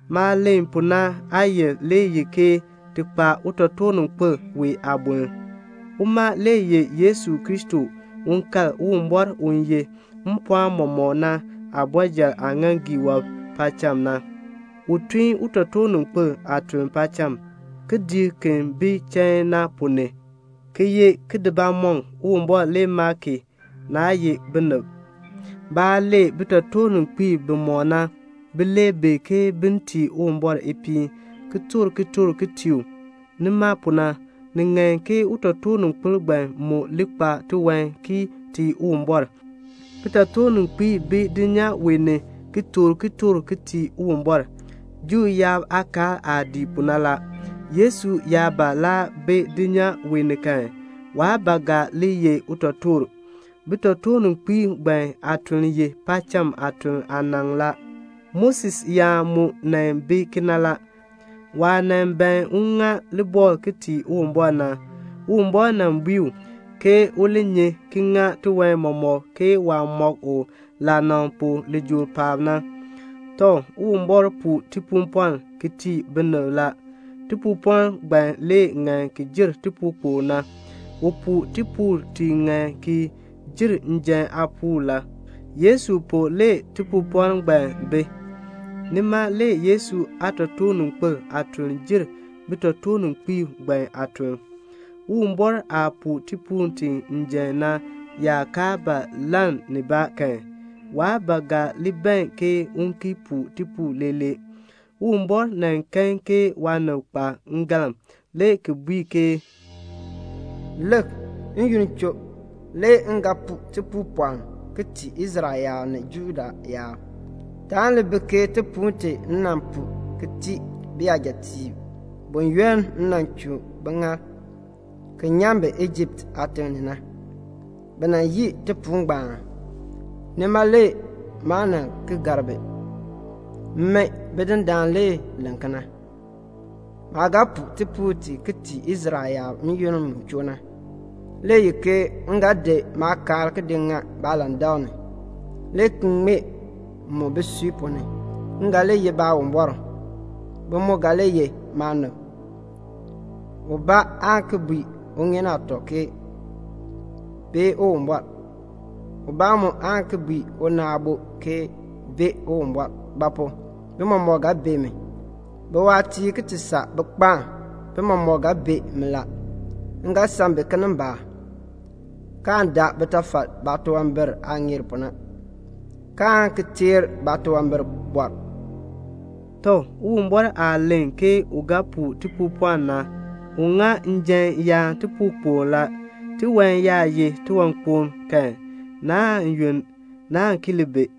Maah len pu na aayil le ye ke ti kpa utotoorninkpil wee aaboln. Uma le ye Yesu Kristo u kal Uwumbɔr u ye mpɔɔn mɔmɔk na aabɔrjal aaŋaaŋgii wɔb paacham na. U tun utotoorninkpil aatuln paacham, kidiik ki bi chain na ponn ni, ki ye kidiibamɔŋ. Uwumbɔr le maa ki, naa ye binib. Baah lee bitotoorninkpiib bimɔk na, bi lee bi ke bin tii Uwumbɔr ipiin, ki toor kitork ki tii u. Nima pu na, ni ŋan ke utotoorninkpil ngbaan mu li kpa tiwan ki tii Uwumbɔr. Bitotoorninkpiib bi dulnyaa wee ni ki toor kitork ki tii Uwumbɔr, Juu yaab aakaal aah dii pu na la. Yesu yaa ba laa bi dulnyaa wee ni kan, waa ba ga li ye utotoor. Bitotoorninkpiib ngbaan aatuln ye paacham aatuln aanaŋ la. Moses yaan mu nan bi kena la. Waah nan ban un ŋa libɔkl ki tii Uwumbɔr na, Uwumbɔr nan bui u, ke u li nyi ki ŋa tiwan mɔmɔk ke waah mɔk u laanaŋ pu lijool paab na. Tɔ, Uwumbɔr puu tipuupɔln ki tii binib la. Tipuupɔln ngbaan le ŋan ki jer tipuukpokl na; u puu tipuul ti ŋan ki jer njan aapuul la. Yesu pu le tipuupɔln ngbaan le bi. Nima le Yesu aatotoorninkpil aatuln jer bitotoorninkpiib ngbaan aatuln. Uwumbɔr aah puu tipuul ti njan na yaa kaa ba lann nibaa kan, waa ba ga li ban ke u ki puu tipuul leelee. Uwumbɔr nan kan ke waanib kpa ngalm, le ki bui ke "Lik, n-yoonn choo, le m ga puu tipuupɔln ki tii Israel yaab ni Juda yaab. Taan li bi ke tipuul ti m nan puu ki tii biyajatiib, buyoonn m nan chuu biŋaal ki nyan bi Ijipt aatiŋ ni na. Bi nan yii tipuul ngbaan, nima le maa nan ki gar bi. Min Bidindaan le len kena. Maah ga puu tipuul ti ki tii Israel yaab n-yoonn mu choo na le ye ke m ga di maakaal ki di ŋa baalandak ni, le ki ŋmee mu bisui ponn ni. M ga li ye Baawumbɔr. Bi mu ga li ye maanib. Ubaa aan ki bui uŋeen aatɔ ke, 'Bee Uwumbɔr.' Ubaa mu aan ki bui una aabo ke, 'Bee Uwumbɔr.' Ba pu? bi mɔmɔk ga bee mi. Biwaatiib ki ti saa bikpaam, bi mɔmɔk ga bee mi la. M ga san bi kinimbaak, kaan daa bitafal baatunwambir aah ŋeer pu na, kaan ki teer baatunwambir." Tɔ, Uwumbɔr aah len ke u ga puu tipuupɔln na, u ŋa njan yaan tipuukpokl la. Tiwan yaa ye tiwankpoŋ kan, naan yunn, naan ki li bi.